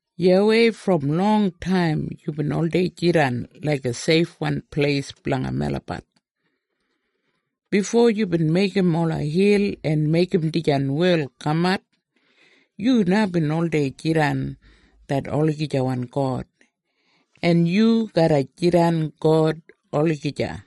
YAWEI, brom longtaim yubin oldei jidan laiga seifwan pleis blanga melabat. Bifo yubin meigim ola hil en meigim dijan wel kamat, yu na bin oldei jidan det olagijawan God, en yu garra jidan God olagija.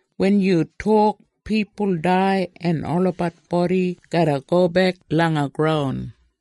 Wen yu tok, pipul dai en olabat bodi garra gobek langa graun.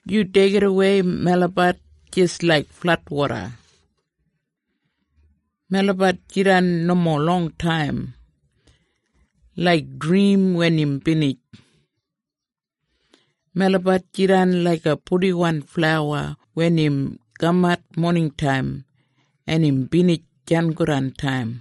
Yu deigidawei melabat jis laik fladwoda. Melabat jidan nomo longtaim, laik drim wen im binij. Melabat jidan laiga purdiwan flawa wen im kamat moningtaim, en im binij sangodantaim.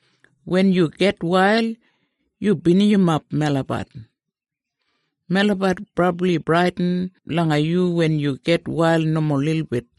Wen yu gitwail, yu binijimap melabat. Melabat brabli bradin langa yu wen yu gitwail nomo lilbit.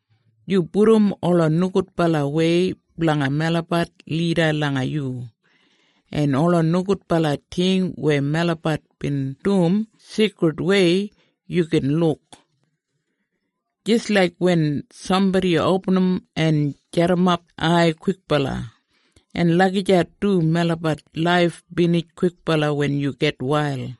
Yu pudum ola nogudbalawei blanga melabat lida langa yu, en ola nogudbala ting weya melabat bin dum sigridwei yu gin luk. Jis laik wen sambodi opinim en jadimap ai kwikbala, en lagijat du melabat laif binij kwikbala wen yu gitwail.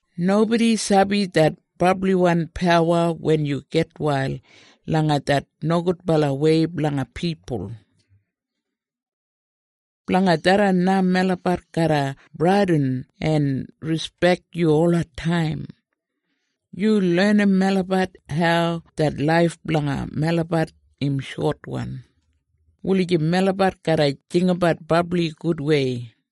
Nobodi sabi det brabliwan pawa wen yu gitwail langa det nogudbalawei blanga pipul. Blanga tharran na melabat garra bradin en rispek yu olataim. Yu lenim melabat hau det laif blanga melabat im shotwan, wulijim melabat garra jinggabat brabli gudwei.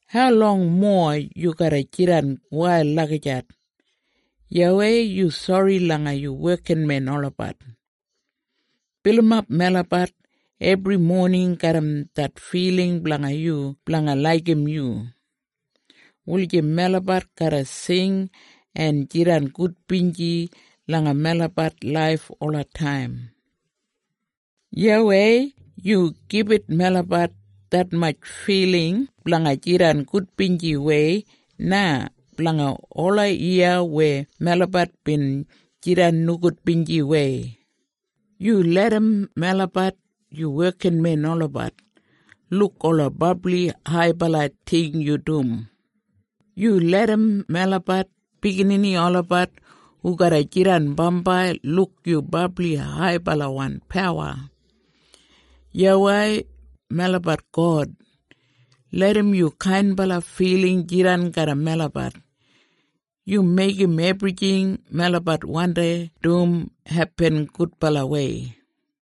Haulong mowa yu garra jidan wail lagijat? YAWEI, yu sori langa yu wekinmen olabat. Bilimap melabat ebri moning garram det filing blanga yu blanga laigim yu, wulijim melabat garra sing en jidan gudbinji langa melabat laif olataim. YAWEI, yu gibit melabat detmatj filing blanga jidan gudbinjiwei na blanga ola yiya weya melabat bin jidan nogudbinjiwei. Yu larram melabat yu wekinmen olabat, luk ola brabli haibala ting yu dum. Yu larram melabat biginini olabat hu garra jidan bambai luk yu brabli haibalawan pawa. YAWEI, melabat God, larram yu kainbala filing jidan garram melabat. Yu meigim ebrijing melabat wandi dum hepin gudbalawei.